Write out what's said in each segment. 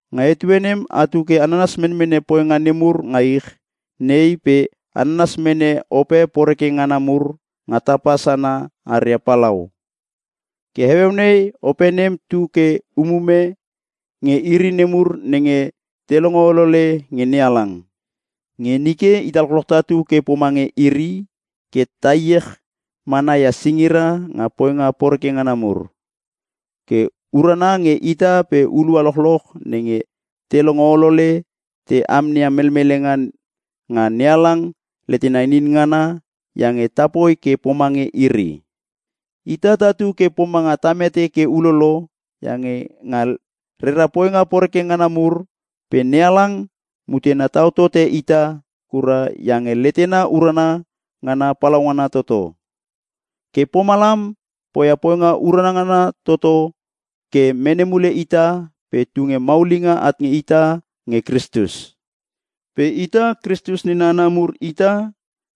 Nga etue nem atu ke a nanas menmene poinga nemur nga ich nei pe a nanas mene ope poreke ngana mur nga tapa sana aria palau. Ke heueu nei ope nem tu ke umume nge iri nemur nenge te longo olole nge NeHalang. Nge nike ita lochloch tatu ke pomange iri, ke ta heiech mana ia singira nga poinga poreke ngana mur. Ke urana nge ita pe hulua lochloch nenge te longo olole ta amneia melmelenga nga NeHalang letena inin ngana iange tapoi ke pomange iri. Ita tatu ke pomanga ta mete ke ulolo iange nga rera poinga poreke ngana mur, pe NeHalang mutena tau tote ita kura iange letena urana ngana palaungana toto. Ke pomalam poia poinga urana ngana toto ke mene mule ita pe tunge maulinga at nge ita nge Kristus. Pe ita Kristus nena hana mur ita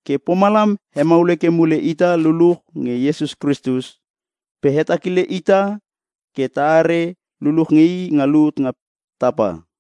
ke pomalam he maul heke mule ita luluch nge Iesus Kristus, pe hetakile ita ke ta are luluch nge i nga lut nga tapa.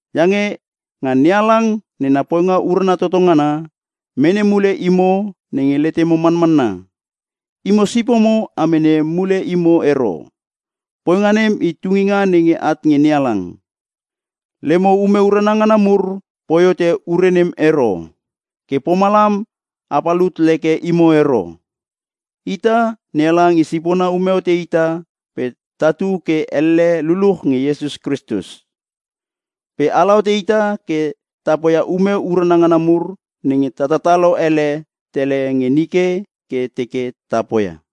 Iange nga NeHalang nena poinga urana toto ngana, mene mule imo nenge letemo manmanna. Imo sipomo a mene mule imo ero. Poinga nem i tunginga nenge at nge NeHalang. Lemo ume urana ngana mur poi hote ure nem ero. Ke pomalam a palut leke imo ero. Ita, NeHalang i sipona ume hote ita pe tatu ke elle luluch nge Iesus Kristus. Pe ala hote ita ke ta poia ume urana ngana mur nenge tatalo ele tele nge nike ke teke ta poia.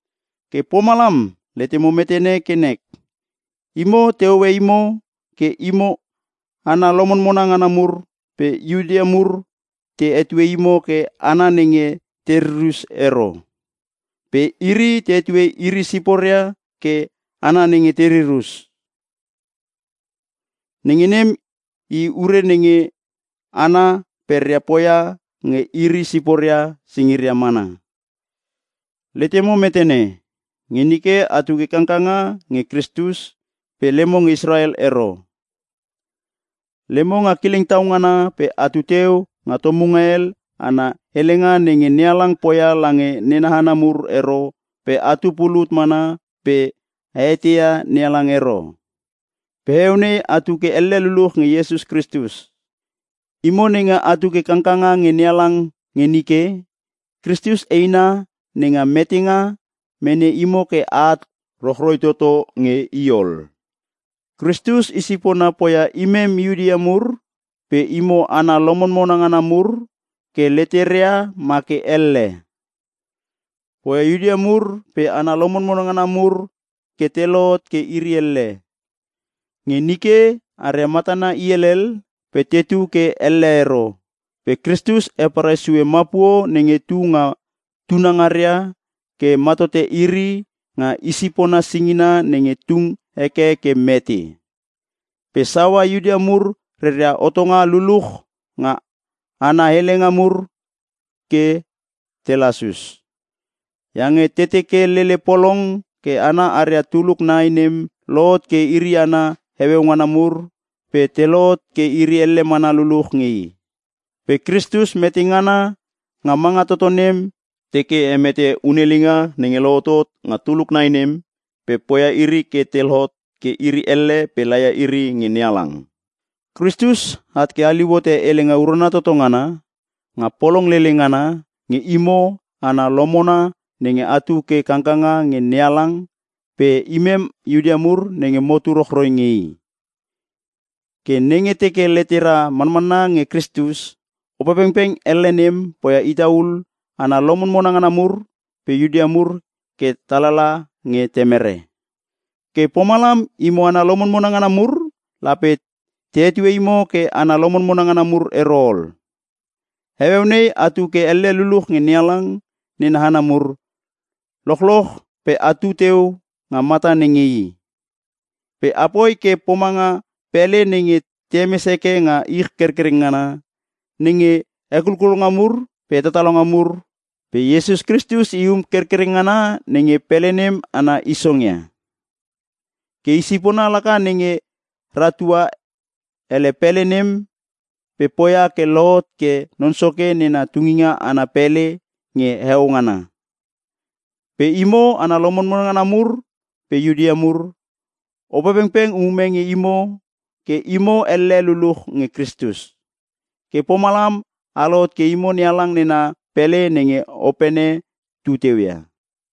Ke pomalam letemo metene ke nek, imo tehoe imo ke imo hana lomonmona ngana mur pe Iuta mur te hetue imo ke “hana nenge te ririr us ero” pe iri te hetue iri siporia ke “hana nenge te ririr us” (nenge nem i ure nenge hana peria poia nga iri siporia singiria mana). Letemo metene, nge nike atu ke kangkanga nge Kristus pe lemo nge Israel ero. Lemo nga kileng tau ngana pe atu teu nga tomunga hel ana helenga nenge NeHalang poia lange nena hana mur ero pe atu pulut mana pe a eteia NeHalang ero. Pe heueu nei atu ke elle luluch nge Iesus Kristus. Imo nenge atu ke kangkanga nge NeHalang nge nike, Kristus eina nenga metengana mene imo ke a at rochroi toto nge i ol. Kristus i sipona poia imem Iuta mur pe imo hana lomonmona ngana mur ke letera ma ke elle. Poia Iuta mur pe hana lomonmona ngana mur ke te lohot ke iri elle. Nge nike aria matana i helel pe tetu ke elle ero, pe Kristus heparai sue mapuo nenge tu nga tuna ngara ke ma tote iri nga i sipona singina nenge tung heke ke mete. Pe saua Iuta mur reria hotonga luluch nga ana helenga mur ke te lasus, iange teke lele polong ke hana aria tuluk nai nem te lohot ke iri hana heueu ngana mur pe te lohot ke iri elle mana luluch nge i. Pe Kristus metengana nga manga toto nem teke hemete hunelinga nenge lohotot nga tuluk nai nem pe poia iri ke te lohot ke iri elle pe laia iri nge NeHalang. Kristus at ke haliu hote helenga urana toto ngana nga polong lele ngana nge imo hana lomonmona nenge atu ke kangkanga nge NeHalang pe nge imem Iuta mur nenge motu ke rochroi nge i. Ke nenge teke letera manmanna nge Kristus, Opepengpeng elle nem poia ita ul hana lomonmona ngana mur pe Iuta mur ke ta lala nge Temere. Ke pomalam imo hana lomonmona ngana mur lape te hetue imo ke hana lomonmona ngana mur ero ol. Heueu nei atu ke elle luluch nge NeHalang nena hana mur lochloch pe atu teu nga mata nenge i. Pe apoi ke pomanga pele nenge te hemes heke nga ich kerkereng ngana, nenge hekulkulonga mur pe hetatalonga mur. Pe Iesus Kristus i um kerkereng ngana nenge pele nem ana isong ia. Ke i sipona laka nenge ratua ele pele nem pe poia ke lohot ke Non Soke nena tunginga ana pele nge heo ngana. Pe imo hana lomonmona ngana mur pe Iuta mur, Opepengpeng umume nge imo ke imo elle luluch nge Kristus. Ke pomalam a lohot ke imo NeHalang nena pele nenge Opene tu teu ia.